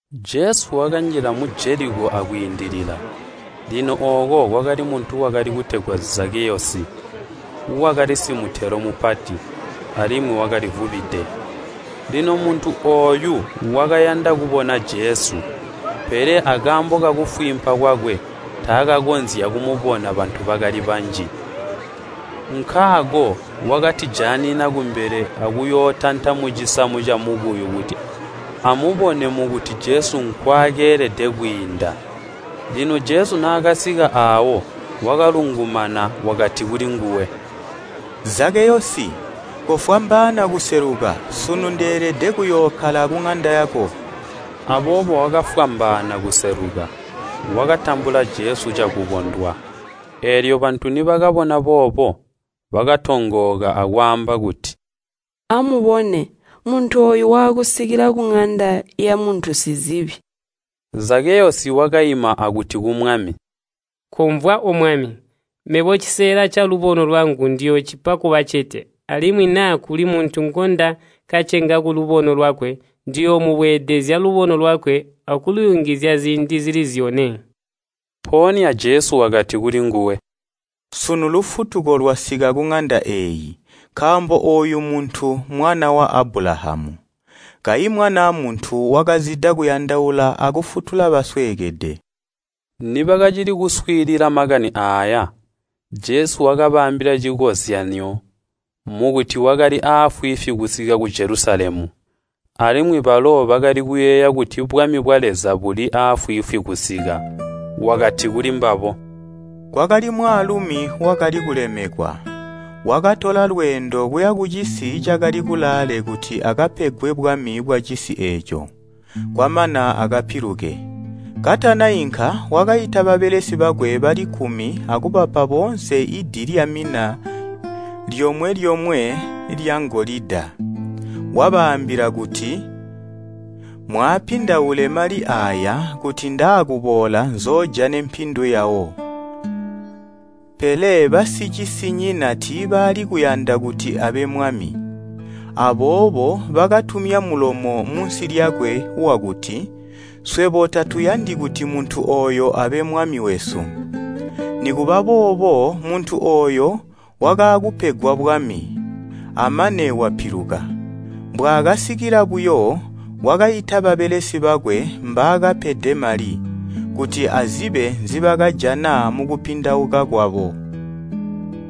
Jesu wakanjila mu Jeliko akwiindilila. Lino ooko kwakali muntu wakali kutegwa Zakkeyosi. Wakali simutelo mupati, alimwi wakalivubide. Lino muntu ooyu wakayanda kubona Jesu, pele akaambo kakufwiimpa kwakwe taakakonzya kumubona bantu bakali banji. Nkaako wakatijaanina kumbele akuyootanta mucisamu camukuyu kuti amubone mukuti Jesu nkwakeelede kwiinda. Lino Jesu naakasika aawo, wakalungumana, wakati kulinguwe, “Zakeyosi, kofwambaana kuseluka, sunu ndeelede kuyookkala kuŋanda yako.” Aboobo wakafwambaana kuseluka, wakatambula Jesu cakukondwa. Eelyo bantu nibakabona boobo, bakatongooka akwaamba kuti, “Amubone, muntu ooyu waakusikila kuŋanda yamuntu sizibi.” Zakeyosi wakaima akuti ku Mwami, “Komvwa, O Mwami! Mebo cisela calubono lwangu ndiyoocipa kubacete, alimwi naa kuli muntu ngundakacenga kulubono lwakwe, ndiyoomubweedezezya lubono lwakwe akuluyungizya ziindi zili zyone.” Mpoonya Jesu wakati kulinguwe, “Sunu lufutuko lwasika kuŋanda eeyi, nkaambo ooyu muntu mwana wa Abulahamu, kayi Mwanaa Muntu wakazida kuyandaula akufutula basweekede.” Nibakacili kuswiilila makani aaya, Jesu wakabaambila cikozyanyo, mukuti wakali afwiifwi kusika ku Jelusalemu, alimwi balo bakali kuyeeya kuti bwami bwa Leza buli afwiifwi kusika. Wakati kulimbabo, “Kwakali mwaalumi wakali kulemekwa, wakatola lweendo kuya kucisi cakali kulaale kuti akapegwe bwami bwacisi eeco, kwamana akapiluke. Katanainka wakaita babelesi bakwe bali kkumi akubapa boonse di lyomwe-lyomwe lyangolida, wabaambila kuti ‘Mwaapindaule mali aaya kuti ndaakuboola nzoojane mpindu yawo.’ “Pele basicisinyina tiibaali kuyanda kuti abe mwami. Aboobo bakatumya mulomo munsi lyakwe wakuti, ‘Swebo tatuyandi kuti muntu ooyo abe mwami wesu.’ “Nikuba boobo muntu ooyo wakaakupegwa bwami, amane wapiluka. Mbwaakasikila buyo, wakaita babelesi bakwe mbaakapede mali, kuti azibe nzibakajana mukupindauka kwabo.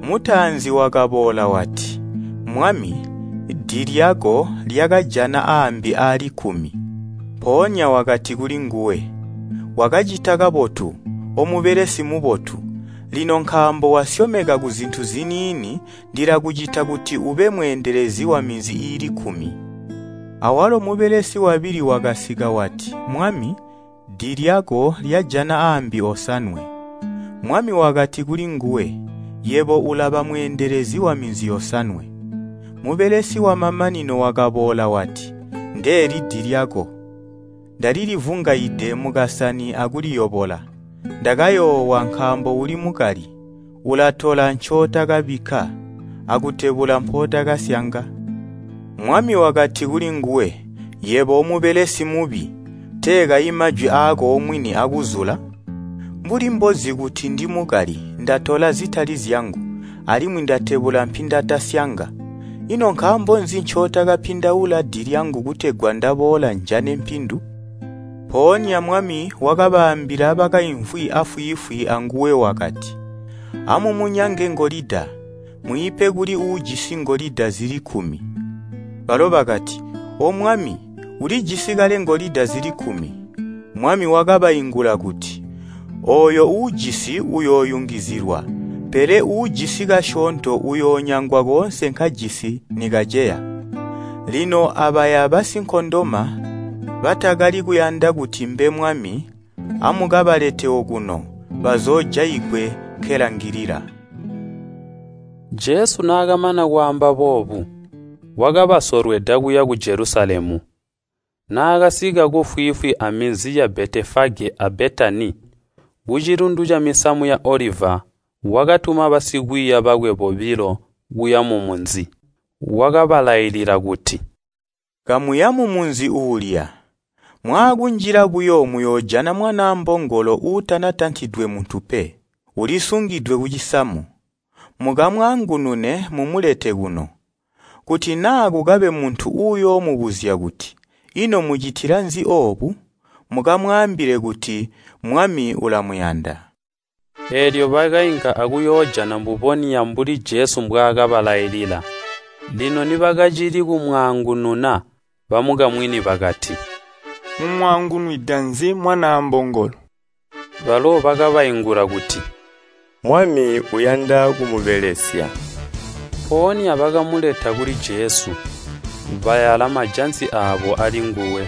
Mutaanzi wakaboola wati, ‘Mwami, di lyako lyakajana aambi aali kkumi.’ Mpoonya wakati kulinguwe, ‘Wakacita kabotu, omubelesi mubotu! Lino nkaambo wasyomeka kuzintu ziniini, ndilakucita kuti ube mweendelezi waminzi iili kkumi.’ Awalo mubelesi wabili wakasika wati, ‘Mwami, di lyako lyajana aambi osanwe.’ Mwami wakati kulinguwe, ‘Yebo ulaba mweendelezi waminzi yosanwe.’ Mubelesi wamamanino wakaboola wati, ‘Ndeeli di lyako. Ndalilivungaide mukasani akuliyobola. Ndakayoowa, nkaambo uli mukali. Ulatola ncootakabikka, akutebula mpootakasyanga.’ “Mwami wakati kulinguwe, ‘Yebo omubelesi mubi! Tee kayi majwi aako omwini akuzula? Mbuli mbozi kuti ndimukali, ndatola zitali zyangu, alimwi ndatebula mpindatasyanga, ino nkaambo nzi ncootakapindaula di lyangu Kutegwa ndaboola njane mpindu?’ Mpoonya mwami wakabaambila bakaimvwi afwiifwi anguwe wakati, ‘Amumunyange ngolida, mwiipe kuli uujisi ngolida, zili kkumi!’ Balo bakati, ‘O Mwami, ulijisi kale ngolida zili kkumi.’ Mwami wakabaingula kuti, ‘Ooyo uujisi uyooyungizizilwa, pele uujisi kasyoonto uyoonyangwa koonse nkajisi nikaceya. Lino abaya basinkondoma batakali kuyanda kuti mbe mwami, amukabalete okuno, bazoojaigwe nkelangilila!’” Jesu naakamana kwaamba boobu, wakabasolweda kuya ku Jelusalemu. Naakasika kufwiifwi aminzi ya Betefage a Betani, kucilundu camisamu ya Oliva, wakatuma basikwiiya bakwe bobilo kuya mumunzi. Wakabalailila kuti, “Kamuya mumunzi uulya. Mwaakunjila buyo muyoojana mwanaa mbongolo uutanatantidwe muntu pe, ulisungidwe kucisamu. Mukamwaangunune mumulete kuno. Kuti naa kukabe muntu uyoomubuzya kuti, ‘Ino mucitila nzi oobu?’ Mukamwaambile kuti, ‘Mwami ulamuyanda.’” Eelyo bakainka akuyoojana mbubonya mbuli Jesu mbwaakabalailila. Lino nibakacili kumwaangununa, bamukamwini bakati, “Mumwaangunwida nzi mwanaa mbongolo?” Balo bakabaingula kuti, “Mwami uyanda kumubelesya.” Mpoonya bakamuleta kuli Jesu, bayala majansi aabo alinguwe,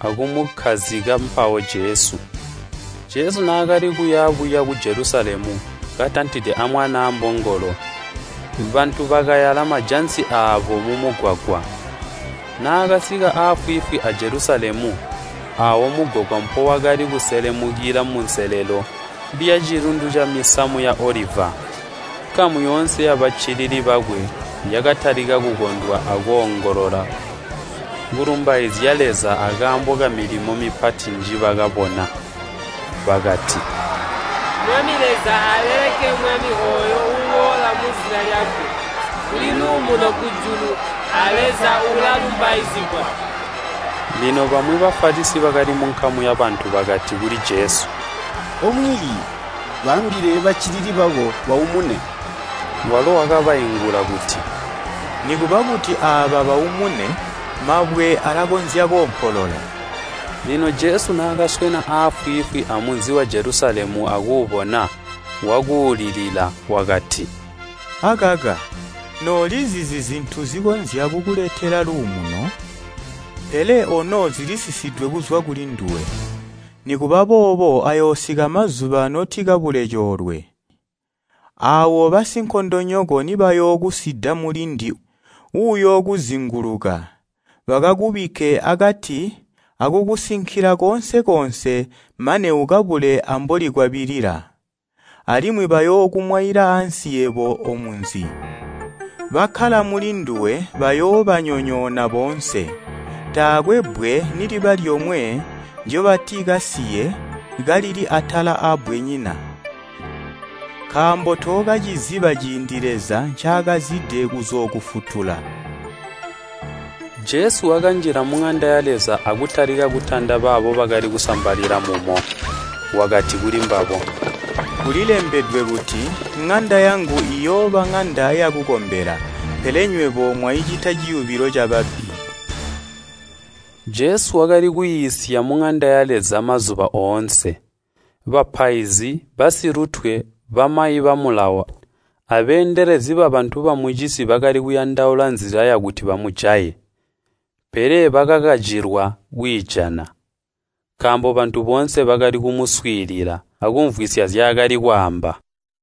akumukkazika mpawo Jesu. Jesu naakali kuya buya ku Jelusalemu katantide amwanaa mbongolo bantu bakayala majansi aabo mumugwagwa. Naakasika afwiifwi a Jelusalemu aawo mugwagwa mpowakali kuselemukila munselelo lyacilundu ca misamu ya Oliva, nkamu yoonse yabaccilili bakwe yakatalika kukondwa akoongolola kulumbaizya Leza akaambo kamilimo mipati njibakabona. Bakati, “Mwami Leza, aaleleke Mwami ooyo uuboola muzina lyakwe! Kuli luumuno kujulu, a Leza ulalumbaizigwa!” Lino bamwi Bafalisi bakali munkamu yabantu bakati kuli Jesu, “O Mwiiyi, baambile baccilili bako baumune.” Walo wakabaingula kuti, “Nikuba kuti aaba baumune, mabwe alakonzya koompolola.” Lino Jesu naakaswena afwiifwi amunzi wa Jelusalemu akuubona, wakuulilila. Wakati, “Akaka noolizizi zintu zikonzya kukuletela luumuno! Pele ono zilisisidwe kuzwa kulinduwe! Nikuba boobo ayoosika mazuba notikabule coolwe, aawo basinkondonyoko nibayookusida mulindi uuyookuzinguluka, bakakubikke akati akukusinkila koonse koonse mane ukabule ambolikwabilila. Alimwi bayookumwaila ansi yebo omunzi. Bakkala mulinduwe bayoobanyonyoona boonse. Taakwe bbwe niliba lyomwe ndyobatikasiye kalili atala aabbwenyina, nkaambo tookaciziba ciindi Leza ncaakazide kuzookufutula!” Jesu wakanjila muŋanda ya Leza akutalika kutanda baabo bakali kusambalila mumo, wakati kulimbabo, “Kulilembedwe kuti, ‘ŋanda yangu iyooba ŋanda yakukombela.’ Pele nywebo mwaicita ciyubilo cababbi!” Jesu wakali kwiisya muŋanda ya Leza mazuba oonse. Bapaizi basilutwe, bamayi ba Mulawo, abeendelezi babantu bamucisi bakali kuyandaula nzila yakuti bamujaye. Pele bakakacilwa kwiijana, nkaambo bantu boonse bakali kumuswiilila, akumvwisya nzyaakali kwaamba.